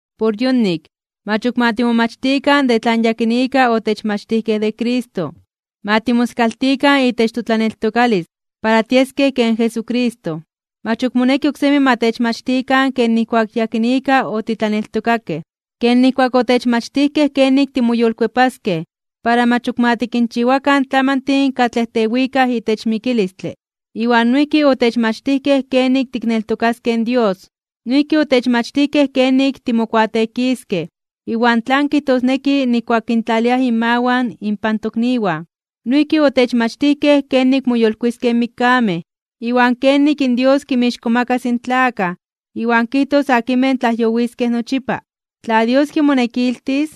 Por yonik, mach ok ma timomachtikan de tlan yakinika otechmachtijkej de Cristo. Ma timoskaltikan itech totlaneltokalis para tieskej ken Jesucristo. Mach ok moneki oksemi ma techmachtikan ken nijkuak yakinika otitlaneltokakej. Ken nijkuak otechmachtijkej kenik timoyolkuepaskej para mach ok ma tikinchiwakan tlamantin katlej tewikaj itech mikilistle, iwan noijki otechmachtijkej kenik tikneltokaskej in Dios. Noijki otechmachtijkej kenik timokuateekiskej iwan tlan kijtosneki nijkuak kintlaliaj inmawan inpan tokniwan. Noijki otechmachtijkej kenik moyolkuiskej (moyolitiskej) in mikkamej, iwan kenik in Dios kinmixkomakas (kintzonmanas) in tlakaj iwan kijtos akinmej tlajyowiskej nochipa. Tla Dios kimonekiltis,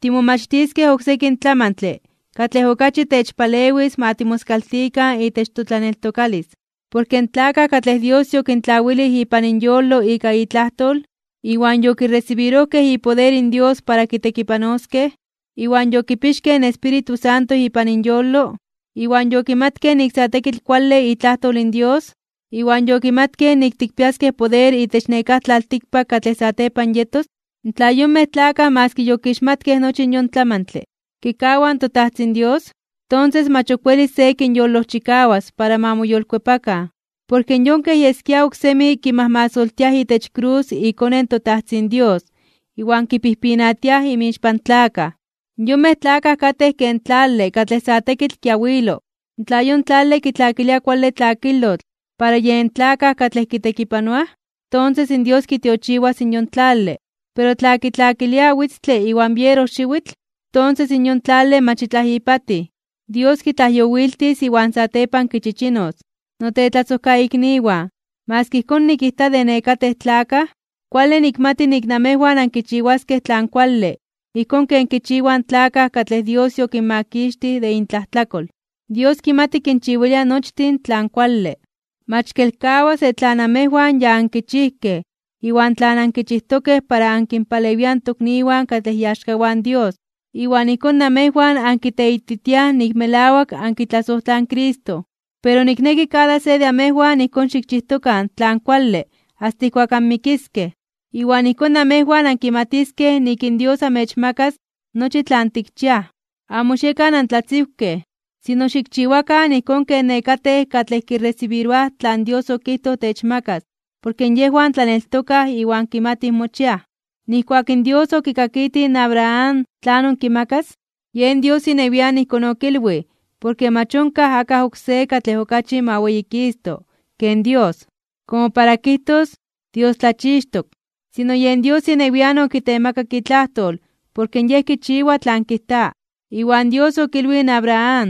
timomachtiskej oksekin tlamantle katlej okachi techpalewis ma timoskaltikan itech totlaneltokalis. Porke in tlakaj katlej Dios yokintlawilij ipan inyolo ika itlajtol, iwan yokiresibirojkej ipoder in Dios para kitekipanoskej, iwan yokipixkej in Espíritu Santo ipan inyolo, iwan yokimatkej nik sa tekitl kuale itlajtol in Dios, iwan yokimatkej nik tikpiaskej poder itech nekáj tlaltikpak katlej satepan yetos, tla yonmej tlakaj maski okixmatkej nochi yon tlamantle, kikawaj in toTajtzin Dios, tonses mach ok welis se kinyolojchikawas para ma moyolkuepakan. Porke yon kej yeskia oksemi kimajmasoltiaj itech krus iKone in toTajtzin Dios iwan kipijpinatiaj inmixpan tlakaj. Yonmej tlakaj katej ken tlale katlej sa tekitl kiawilo. Tla yon tlale kitlakilia kuale tlakilotl para yen tlakaj katlej kitekipanoaj, tonses in Dios kitiochiwas in yon tlale. Pero tla kitlakilia witztle iwan bierojxiwitl, tonses in yon tlale mach itlaj ipatij. Dios kitlajyowiltis iwan satepan kichichinos. Notetlasojkaikniwan, maski ijkón nikijta de nekatej tlakaj, kuale nikmati nik amejwan ankichiwaskej tlan kuale ijkón ken kichiwaj in tlakaj katlej Dios yokinmakixtij de intlajtlakol. Dios kimati kinchiwilia nochtin tlan kuale. Mach kelkawas de tlan namejwan ya ankichijkej iwan tlan ankichijtokej para ankinpalewiaj in tokniwan katlej iaxkawan Dios. Iwan ijkón namejwan ankiteititiaj nik melawak ankitlasojtlaj in Cristo. Pero nikneki kada de se amejwan ijkón xikchijtokan tlan kuale asta ijkuak anmikiskej, iwan ijkón namejwan ankimatiskej nik in Dios amechmakas nochi tlan tikchiaj. Amo xiekan antlatziwkej, sino xikchiwakan ijkón ken nekatej katlej kiresibiroaj tlan Dios okijtoj techmakas porke yejwan tlaneltokaj iwan kimatij mochiaj. Nijkuak in Dios okikakitij in Abraham tlanon kimakas, yen Dios inewian ijkón okilwij porke mach onkaj akaj oksé katlej okachi ma weyikisto (ma weyitito) ken Dios komo para kijtos “Dios tlachixtok”, sino yen Dios inewian okitemakak itlajtol porke Yej kichiwa tlan kijta. Iwan Dios okilwij in Abraham: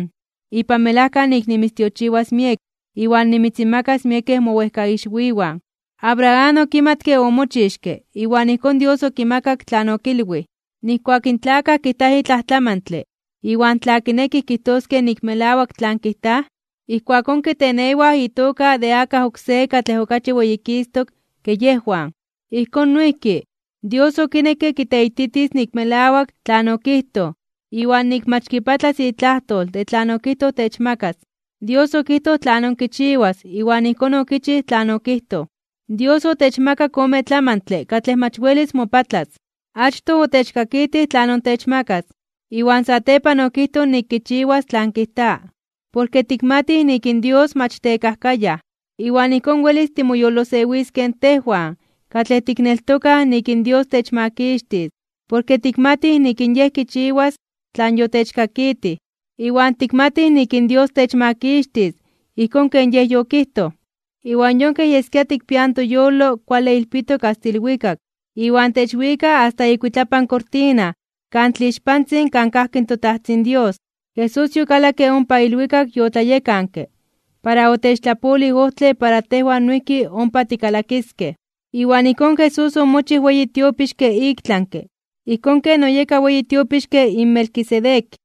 “Ipan melajka nik nimitztiochiwas miek iwan nimitzinmakas miekej mowejkaixwiwan.” Abraham okimatke omochixke iwan ijkón Dios okimakak tlan okilwij. Nijkuak in tlakaj kijtaj itlaj tlamantle iwan tla kinekij kijtoskej nik melawak tlan kijtaj, ijkuakón kitenewaj itoka de akaj oksé katlej okachi weyikistok (weyititok) ke yejwan. Ijkón noijki, Dios okinekke kiteititis nik melawak tlan okijtoj iwan nik mach kipatlas itlajtol de tlan okijtoj techmakas. Dios okijtoj tlanon kichiwas iwan ijkón okichij tlan okijtoj. Dios otechmakak ome tlamantle katlej mach welis mopatlas. Achtoj otechkakitij tlanon techmakas, iwan satepan okijtoj nik kichiwas tlan kijta, porke tikmatij nik in Dios mach tekajkayaj. Iwan ijkón welis timoyolosewiskej tejwan katlej tikneltokaj nik in Dios techmakixtis porke tikmatij nik in Yej kichiwas tlan yotechkakitij. Iwan tikmatij nik in Dios techmakixtis ijkón ken Yej yokijtoj. Iwan yon kej yeskia tikpiaj in toyolo kuale ilpitok asta ilwikak iwan techwika asta ikuitlapan kortina Kan Tlixpantzin kan kajki toTajtzin Dios. Jesús yokalakke ompa ilwikak yotlayekanke para otechtlapolij ojtle para tejwan noijki ompa tikalakiskej. Iwan ijkón Jesús omochij weyi tiopixke iktlanke (ik tlami) ijkón ken oyeka weyi tiopixke in Melquisedec.